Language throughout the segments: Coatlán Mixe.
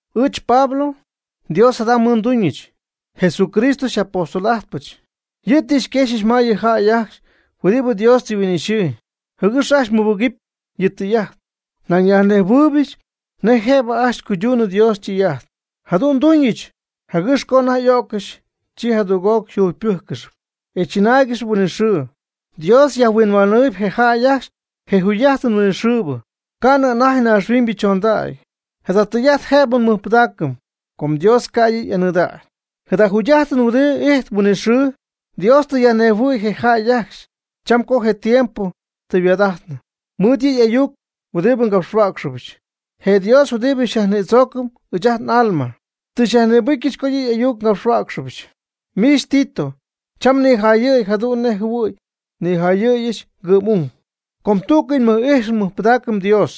Ɨɨch Pablo, Dios jada mɨɨd nduuñɨch, Jesucristo xy'apóstol'ajtpɨch. Yɨ' tɨ xyquexyɨch ma yɨ jäy ajcxy huɨdibɨ Dios tɨ yhuin'ixyii, jɨgɨx ajcxy mɨbɨgɨpy yɨ' ytɨy'ajt. Nañ nyajnɨmähuɨbɨch nej jëb ajcxy cuyduunɨ Dios ytɨy'ajt. Jadu'n nduuñɨch jɨgɨx co anajty y'o'ccɨxy, chi jadüg'oc yjugypɨ́jccɨxɨpy e tzɨnáaygɨxɨpy huinɨxɨɨ. Dios yajhuinhuanɨɨy je jäy ajcxy je jugy'ajtɨn huinɨxɨɨbɨ, ca'nɨ anajty naaxhuiñybɨ chondägy. Jada tɨy'ajt jëb nmɨjpɨdaacɨm com Dios ca' yɨ' y'anɨɨdägy. Jada jugy'ajtɨn huɨdibɨ ijtp huinɨxɨɨ, Dios tɨ yajnejhuɨ̈y je jäy ajcxy cham co je tiempo tɨ yhuaad'ajtnɨ, mɨɨd yɨ' y'ayuc huɨdibɨ ngapxhuäcxɨbɨch. Je Dios huɨdibɨ xyajnïdzoocɨm ɨɨch ajt n'alma tɨ xyajnïbɨcyɨch co yɨ' y'ayuc ngapxhuäcxpyɨch. Miich Tito, cham nijayɨ̈y jadu'n nej jɨhuɨ̈y nijayɨ̈yɨch ngɨ'm'ung. Com tú'cɨy nmɨj'ijxɨm nmɨjpɨdaacɨm Dios.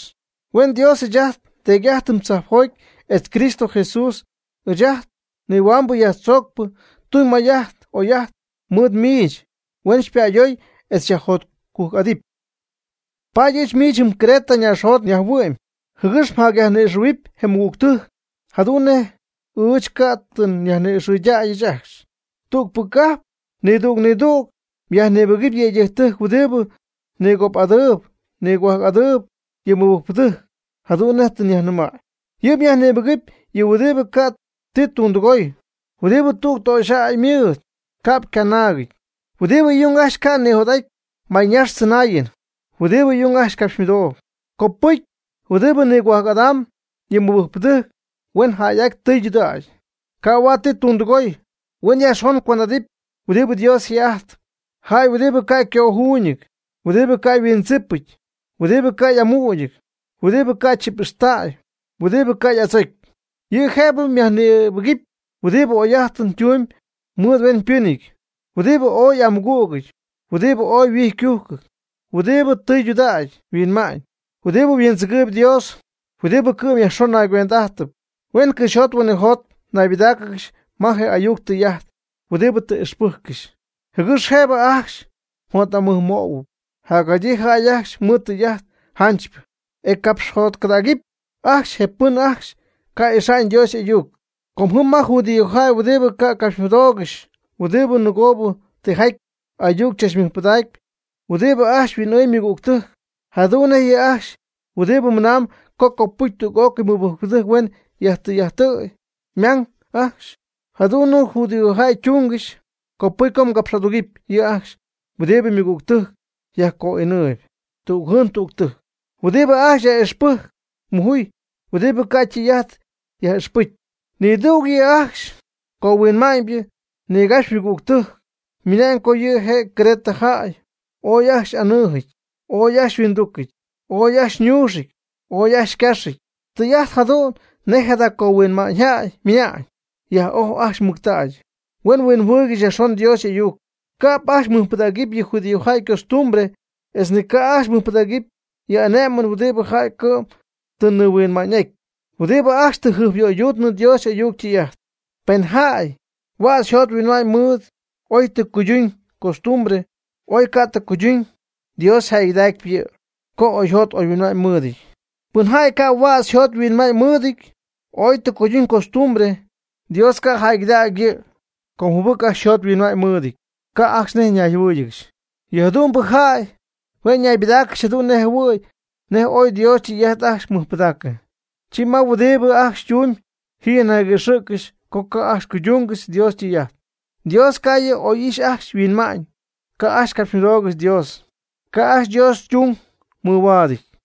Huen Dios ɨɨch ajt nDeedy tzajpjotpy etz Cristo Jesús ɨɨch ajt nihuambɨ yajtzoocpɨ tuñ may'ajt oy'ajt mɨɨd miich, huen xypa'ayooy etz xyajjotcujc'adɨpy. Paady ɨɨch miich jɨm Creta ñaaxjot nyajhuɨ'my, jɨgɨx mjacyajnïxɨ̈huɨpy je mɨgügtɨjc jadu'n nej ɨɨch ca' tɨ nyajni'ixɨydäyɨch ajcxy. Tügpɨ cajp nidüg nidüg myajnïbɨgɨpy yëydɨjctɨjc huɨdibɨ nigop'adɨɨb nigohuajc'adɨɨb yɨ mɨbɨjcpɨdɨjc, jadu'n nej tɨ nyajnɨmäy. Yɨ' myajnïbɨgɨpy yɨ huɨdibɨ ca' ti tundɨgoy; huɨdibɨ tüg töxyjäy mɨɨd, ca'p ycanaagɨty; huɨdibɨ y'ung ajcxy ca' nijot'aty mayñaax tzɨnaayɨn; huɨdibɨ y'ung ajcxy ycapxymɨdooyb. Copɨcy huɨdibɨ nigohuajc'adamb yɨ mɨbɨjcpɨdɨjc huen jäy'aty tɨydudägy, ca' huaad ti tundɨgoy; huen yajxon cuend'adɨpy huɨdibɨ Dios yje'ajtpy; jäy huɨdibɨ ca' ycöjuuñɨty; huɨdibɨ ca' yhuindzipɨty; huɨdibɨ ca' y'amügɨty; huɨdibɨ ca' chip'ixtäy; huɨdibɨ ca' y'adzocy. Yɨ' jëbɨ myajnïbɨgɨpy huɨdibɨ oyjäy'ajtɨn tuñ mɨɨd hueñytimypɨnɨty; huɨdibɨ ooy y'amɨgügɨty; huɨdibɨ huijycujc; huɨdibɨ tɨydudägy yhuinma'ñ; huɨdibɨ huindzɨgɨɨb Dios; huɨdibɨ cɨ'm yajxon naygüend'ajtɨp. Huen cɨxyjot huinɨjot naybɨdáacɨgɨxy ma je ayuc tɨy'ajt huɨdibɨ tɨ ixpɨjccɨxy, jɨgɨx jëbɨ ajcxy jot'amɨjmöhuɨpy jacjadyii jäy ajcxy mɨɨd tɨy'ajt janchypɨ, e capxjotcɨdägɨpy ajcxy je pɨn ajcxy ca' ixa'ñ Dios y'ayuc. Com ji may judíojäy huɨdibɨ ca' ycapxymɨdoogɨxy, huɨdibɨ nɨgoobɨ tijaty ayuc tzachnimɨydacp; huɨdibɨ ajcxy huin'ɨɨmb ymɨgügtɨjc, jadu'n nej yɨ' ajcxy huɨdibɨ mɨnamb co copɨcy tüg'ócɨy mɨbɨjcpɨ huen yajtɨy'ajtɨ̈y ymang ajcxy, jadu'n nej judíojäy tungɨxy. Copɨcy co mgapx'adugɨpy yɨ' ajcxy huɨdibɨ ymɨgügtɨjc yajco'inɨɨyb tüg jɨɨn tüg tɨjc; huɨdibɨ ajcxy yaj'ixpɨjcp mujuy; huɨdibɨ ca' tɨy'ajt yaj'ixpɨjccɨxy. Nidüg yɨ' ajcxy cohuinma'ñybɨ nigapxy ymɨgügtɨjc ymɨna'ñ co yɨ Creta jäy ooy ajcxy y'anɨɨjɨty, ooy ajcxy huinducɨty, ooy ajcxy ñuuxɨty, ooy ajcxy ycaaxɨty. Tɨy'ajt jadu'n nej jada cohuinma'ñyjäy ymɨna'ñ. Yaj'oj ajcxy mɨctägy, huen huinjɨhuɨɨygɨxy yajxon Dios y'ayuc. Ca'p ajcxy mɨjpɨdaacɨpy yɨ judíojäy ycostumbre etz ni ca' ajcxy mɨjpɨdaaccɨp yɨ y'ane'mɨn huɨdibɨ jäy cɨ'm tɨ nihuinma'ñ'aty, huɨdibɨ ajcxy tɨ jɨjpyöyduutnɨ Dios y'ayuc ytɨy'ajt. Pɨn jäy huädz yjot yhuinma'ñ mɨɨd, oy tɨ jacuyduñ costumbre, o oy ca' tɨ cuyduñ, Dios yjäygɨdacpy yɨ' co oyjot oyhuinma'ñ mɨɨdɨty. Pɨn jäy ca' huädz yjot yhuinma'ñ mɨɨdɨty, oy tɨ jacuyduñ costumbre, Dios ca' jäygɨdägy yɨ' com jɨbɨc ajcxy yjot yhuinma'ñ mɨɨdɨty, ca' ajcxy nej ñayjɨhuɨ́ɨyɨgɨxy. Yɨ jadu'mbɨ jäy hue' ñaybɨdáacɨgɨxy jadu'n nej jɨhuɨ̈y nej ooy Dios ytɨy'ajt ajcxy mɨjpɨdaacɨ, chi ma huɨdibɨ ajcxy ytumyb ji yajniguëxɨ̈ccɨxy co ca' ajcxy cuydungɨxy Dios ytɨy'ajt. Dios ca' yɨ' oy ijx ajcxy yhuinma'ñ, ca' ajcxy capxymɨdoogɨxy Dios, ca' ajcxy Dios ytung mɨhuaadɨty.